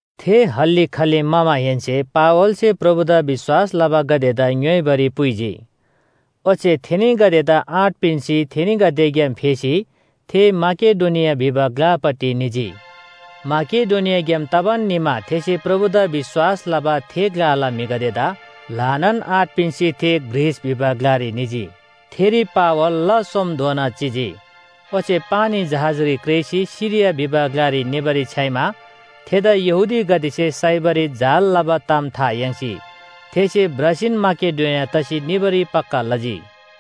थे हल्‍ली खल्‍ली म्‍हमाहेन्‍से पावलसे प्रभुदा विश्‍वास लबागदेदा ङ्‌योइबारी पुइजी, ओच्‍छे थेनीगदेदा आँट पिन्‍सी थेनीगदेग्‍याम फेसी थे माकेडोनिया भिबा ग्‍लापट्टि निजी। माकेडोनियाग्‍याम तबान निमा थेसे प्रभुदा विश्‍वास लबा थे ग्‍लाला म्‍हिगदेदा ल्‍हानान आँट पिन्‍सी थे ग्रीस भिबा ग्‍लारी निजी। थेरी पावल ला सोमधोना चिजी। ओच्‍छे पानी जहाजरी क्रेःसी सिरिया भिबा ग्‍लारी निबारी छ्‌याइमा थेदा यहूदीगदेसे साइबारी जाल लबा ताम था याङ्सी थेसे भ्रसीन माकेडोनिया तसी निबारी पक्‍का लजी।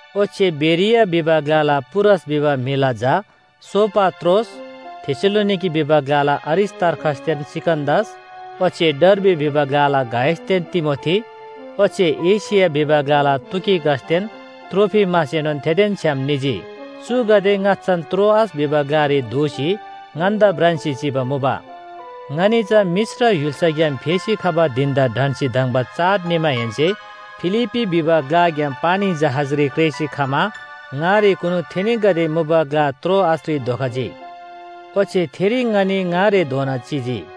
ओच्‍छे बेरिया भिबा ग्‍लाला पुरस भिबा म्‍हिला झा सोपात्रोस, थेसलोनिके भिबा ग्‍लाला अरिस्‍तार्खसदेन सिकन्‍दस ओच्‍छे डर्बी भिबा ग्‍लाला गायसदेन तिमोथी ओच्‍छे एशिया भिबा ग्‍लाला तुखिकसदेन त्रोफिमसएनोन थेदेन छ्‌याम निजी। चुगदे ङाच्‍छान त्रोआस भिबा ग्‍लारी धोसी ङन्‍दा भ्रान्‍सी चिबा मुबा। ङनी चा मिश्र य्‍हुल्‍साग्‍याम फेसी खबा धिन‍दा ढन्‍सी धङ्बा चाड निमाहेन्‍से फिलिप्‍पी भिबा ग्‍लाग्‍याम पानी जहाजरी क्रेःसी खमा ङारेकुनु थेनीगदे मुबा ग्‍ला त्रोआसरी धोखजी, ओच्‍छे थेरी ङनी ङारेधोना चिजी।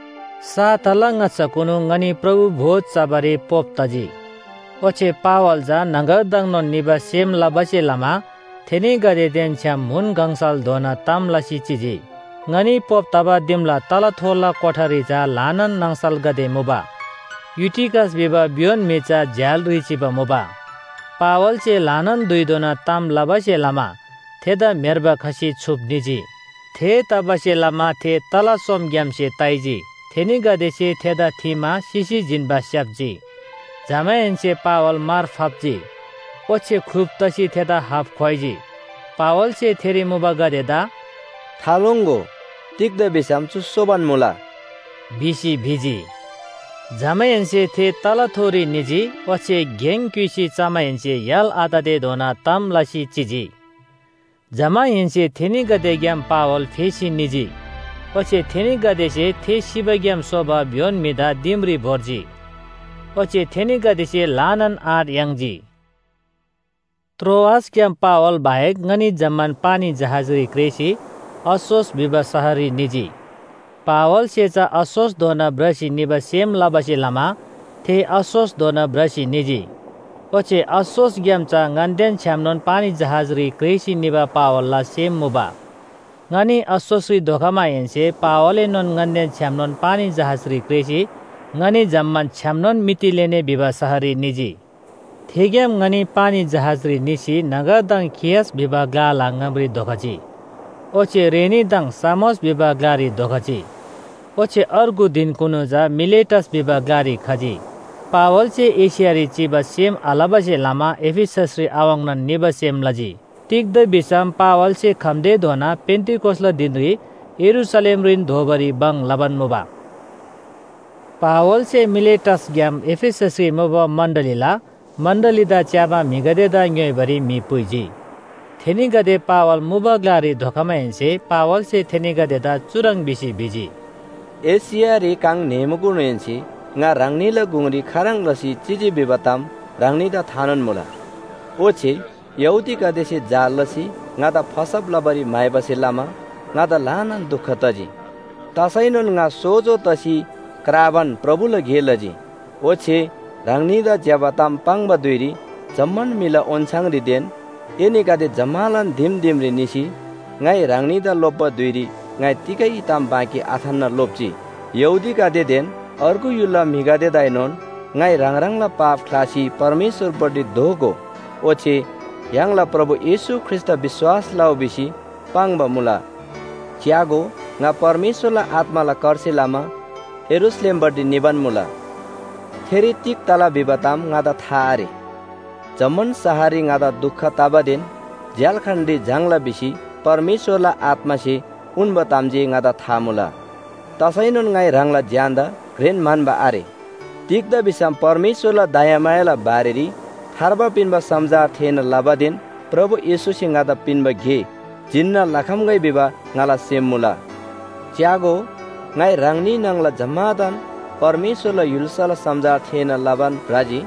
साताला ङाच्‍छाकुनु ङनी प्रभु भोज चबारी पोप तजी, ओच्‍छे पावल चा न्‍हङगरदङनोन निबा सेम लबासे लमा थेनीगदेदेन छ्‌याम म्‍हुन गङसलधोना ताम लसी चिजी। ङनी पोप तबा दिमला तलाथोला कोठारी चा ल्‍हानान नाङसलगदे मुबा। युटिकस भिबा भ्‍योन म्‍हि चा झ्‍यालरी चिबा मुबा। पावलसे ल्‍हानान धुइधोना ताम लबासे लमा थेदा म्‍हेर्बा खसी छुप निजी। थेतबासेलमा थे तला सोमग्‍यामसे ताइजी, थेनीगदेसे थेदा थीमा सिसी जिन्‍बा स्‍याप्‍जी। जमाहेन्‍से पावल मार फाप्‍जी, ओच्‍छे ख्‍लुप तसी थेदा हाप ख्‍वाइजी। पावलसे थेरी मुबागदेदा “थालोङ्‍गो, तिग्‍दा भिसम चु सोबान मुला” भिसी भिजी। जमाहेन्‍से थे तलाथोरी निजी ओच्‍छे गेङ क्‍युइसी चमाहेन्‍से य्‍हाल आततेधोना ताम लसी चिजी। जमाहेन्‍से थेनीगदेग्‍याम पावल फेसी निजी। ओच्‍छे थेनीगदेसे थे सिबाग्‍याम सोबा भ्‍योन म्‍हिदा दिमरी भोर्जी। ओच्‍छे थेनीगदेसे ल्‍हानान आँट याङ्जी। त्रोआसग्‍याम पावल बाहेक ङनी जम्‍मान पानी जहाजरी क्रेःसी अस्‍सोस भिबा शहररी निजी। पावलसे चा अस्‍सोसधोना भ्रसी निबा सेम लबासे लमा थे अस्‍सोसधोना भ्रसी निजी। ओच्‍छे अस्‍सोसग्‍याम चा ङन्‍देन छ्‌यामनोन पानी जहाजरी क्रेःसी निबा पावलला सेम मुबा। ङनी अस्‍सोसरी धोखमाहेन्‍से पावलएनोन ङन्‍देन छ्‌यामनोन पानी जहाजरी क्रेःसी ङनी जम्‍मान छ्‌यामनोन मितिलेने भिबा शहररी निजी। थेग्‍याम ङनी पानी जहाजरी निसी न्‍हङगरदङ खियस भिबा ग्‍लाला ङामरी धोखजी, ओच्‍छे रेनीदङ सामोस भिबा ग्‍लारी धोखजी। ओच्‍छे अर्गु धिनकुनु चा मिलेटस भिबा ग्‍लारी खजी। पावलसे एशियारी चिबा सेम आलबासे लमा एफिससरी आवाङ्‌नान निबा सेम लजी। तिग्‍दा भिसम पावलसे खम्‍तेधोना पेन्‍तिकोसला धिनरी यरूशलेमरीन दोबारी भङ लबान मुबा। पावलसे मिलेटसग्‍याम एफिससरी मुबा मण्‍डलीला मण्‍डलीदा च्‍याबा म्‍हिगदेदा ङ्‌योइबारी म्‍हि पुइजी। थेनीगदे पावल मुबा ग्‍लारी धोखमाहेन्‍से पावलसे थेनीगदेदा चुह्रङ् भिसी भिजी, “एशियारी काङ न्‍हेःमाकुनुहेन्‍से ङा ह्राङनीला गुङरी खाह्रङ् लसी चिजी भिबा ताम ह्राङनीदा थानोन मुला। ओच्‍छे यहूदीगदेसे जाल लसी ङादा फसब लबारी म्‍हाइबासे लमा ङादा ल्‍हानान दुख तजी, तसैनोन ङा सोजो तसी क्राबान प्रभुला गे लजी। ओच्‍छे ह्राङनीदा ज्‍यबा ताम पाङ्बा धुइरी जम्‍मान म्‍हिला ओन्‍छाङरीदेन एनीगदे जम्‍मालान दिम दिमरी निसी ङाइ ह्राङनीदा लोप्‍बा धुइरी ङाइ तिगै ताम बाँकी आथान्‍ना लोप्‍जी। यहूदीगदेदेन अर्गु य्‍हुलला म्‍हिगदेदाएनोन ङाइ ह्राङ ह्राङला पाप ख्‍लासी परमेश्‍वरपट्टि दोःगो ओच्‍छे य्‍हाङला प्रभु येशू ख्रीष्‍टदा विश्‍वास लउ भिसी पाङ्बा मुला। “च्‍यागो, ङा परमेश्‍वरला आत्‍माला करसे लमा यरूशलेमपट्टि निबान मुला, थेरी तिग तला भिबा ताम ङादा था आरे। जम्‍मान शहररी ङादा दुख तबादेन झ्‍याल्‍खानरी झाङ्‌ला भिसी परमेश्‍वरला आत्‍मासे उन्‍बा ताम जे ङादा था मुला। तसैनोन ङाइ ह्राङला ज्‍यानदा घ्रेन म्‍हन्‍बा आरे, तिग्‍दा भिसम परमेश्‍वरला दयामायाला बारेरी थार्बा पिन्‍बा समाचार थेःना लबादेन प्रभु येशूसे ङादा पिन्‍बा गे जिन्‍ना लखम्‍गै भिबा ङाला सेम मुला। “च्‍यागो, ङाइ ह्राङनी न्‍हङला जम्‍मादान परमेश्‍वरला य्‍हुल्‍साला समाचार थेःना लबान भ्रजी,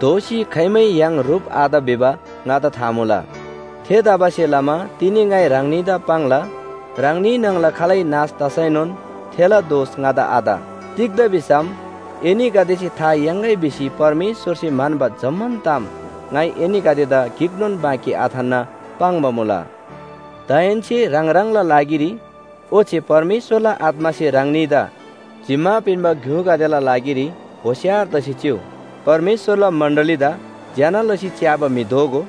दोःसी खाइमै य्‍हाङ ह्रुप आत भिबा ङादा था मुला। थेतबासेलमा तिनी ङाइ ह्राङनीदा पाङ्ला, ह्राङनी न्‍हङला खालै नाश तसैनोन थेला दोष ङादा आत। तिग्‍दा भिसम एनीगदेसे था याङ्‌गै भिसी परमेश्‍वरसे म्‍हन्‍बा जम्‍मान ताम ङाइ एनीगदेदा गिकनोन बाँकी आथान्‍ना पाङ्बा मुला। “दाहेन्‍से ह्राङ ह्राङलान लागिरी ओच्‍छे परमेश्‍वरला आत्‍मासे ह्राङनीदा जिम्‍मा पिन्‍बा ग्‍युगदेला लागिरी होशियार तसी चिउ। परमेश्‍वरला मण्‍डलीदा ज्‍यना लसी च्‍याबा म्‍हि दोगो,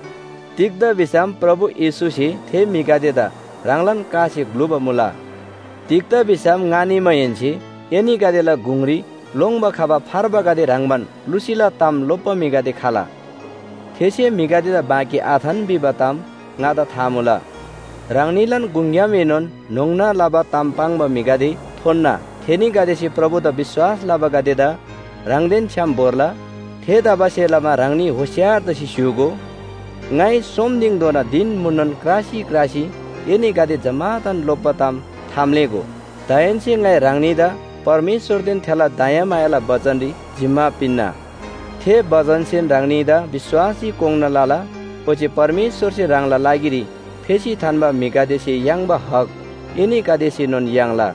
तिग्‍दा भिसम प्रभु येशूसे थे म्‍हिगदेदा ह्राङलान कासे ग्‍लुबा मुला। तिग्‍दा भिसम ङा निमाहेन्‍से एनीगदेला गुङरी लोङ्‌बा खबा फार्बागदे ह्रङ्‌बान लुसीला ताम लोप्‍बा म्‍हिगदे खला, थेसे म्‍हिगदेदा बाँकी आथान भिबा ताम ङादा था मुला। ह्राङनीलान गुङग्‍यामएनोन न्‍होङ्ना लबा ताम पाङ्बा म्‍हिगदे थोन्‍ना, थेनीगदेसे प्रभुदा विश्‍वास लबागदेदा ह्राङदेन छ्‌याम भोर्ला। थेतबासेलमा ह्राङनी होशियार तसी स्‍य्‍हूगो, ङाइ सोम दिङधोना धिन म्‍हुननोन क्रासी क्रासी एनीगदे जम्‍मादान लोप्‍बा ताम थाम्‍लेःगो। “दाहेन्‍से ङाइ ह्राङनीदा परमेश्‍वरदेन थेला दयामायाला बचनरी जिम्‍मा पिन्‍ना, थे बचनसेन ह्राङनीदा विश्‍वासरी कोङ्‌ना लला, ओच्‍छे परमेश्‍वरसे ह्राङला लागिरी फेसी थान्‍बा म्‍हिगदेसे याङ्बा हक एनीगदेसेनोन याङ्ला।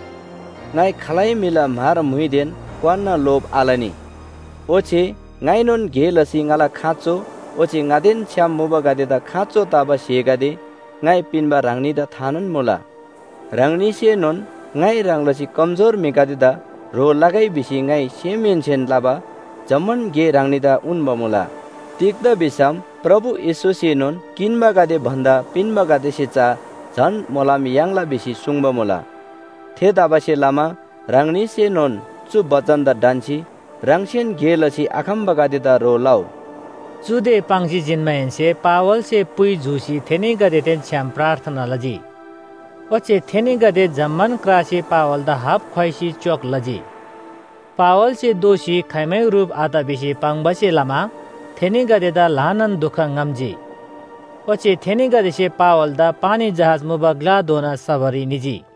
ङाइ खालै म्‍हिला म्‍हर, म्‍हुइदेन क्‍वान्‍ना लोभ आलनी। ओच्‍छे ङाइनोन गे लसी ङाला खाँचो ओच्‍छे ङादेन छ्‌याम मुबागदेदा खाँचो तबा स्‍हेगदे ङाइ पिन्‍बा ह्राङनीदा थानोन मुला। ह्राङनीसेनोन ङाइ ह्रङ् लसी कमजोर म्‍हिगदेदा ह्रो लगै भिसी ङाइ सेमहेन्‍सेन लबा जम्‍मान गे ह्राङनीदा उन्‍बा मुला, तिग्‍दा भिसम प्रभु येशूसेनोन ‘किन्‍बागदे भन्‍दा पिन्‍बागदेसे चा झन मोलम याङ्ला’ भिसी सुङ्बा मुला। थेतबासेलमा ह्राङनीसेनोन चु बचनदा ढन्‍सी ह्राङसेन गे लसी आखम्‍बागदेदा ह्रो लउ।” चुदे पाङ्सी जिन्‍माहेन्‍से पावलसे पुइ जूसी थेनीगदेदेन छ्‌याम प्रार्थना लजी। ओच्‍छे थेनीगदे जम्‍मान क्रासी पावलदा हापख्‍वाइसी च्‍योक लजी। पावलसे दोःसी खाइमै ह्रुप आत भिसी पाङ्बासे लमा थेनीगदेदा ल्‍हानान दुख ङ्‌हम्‍जी। ओच्‍छे थेनीगदेसे पावलदा पानी जहाज मुबा ग्‍लाधोना सबारी निजी।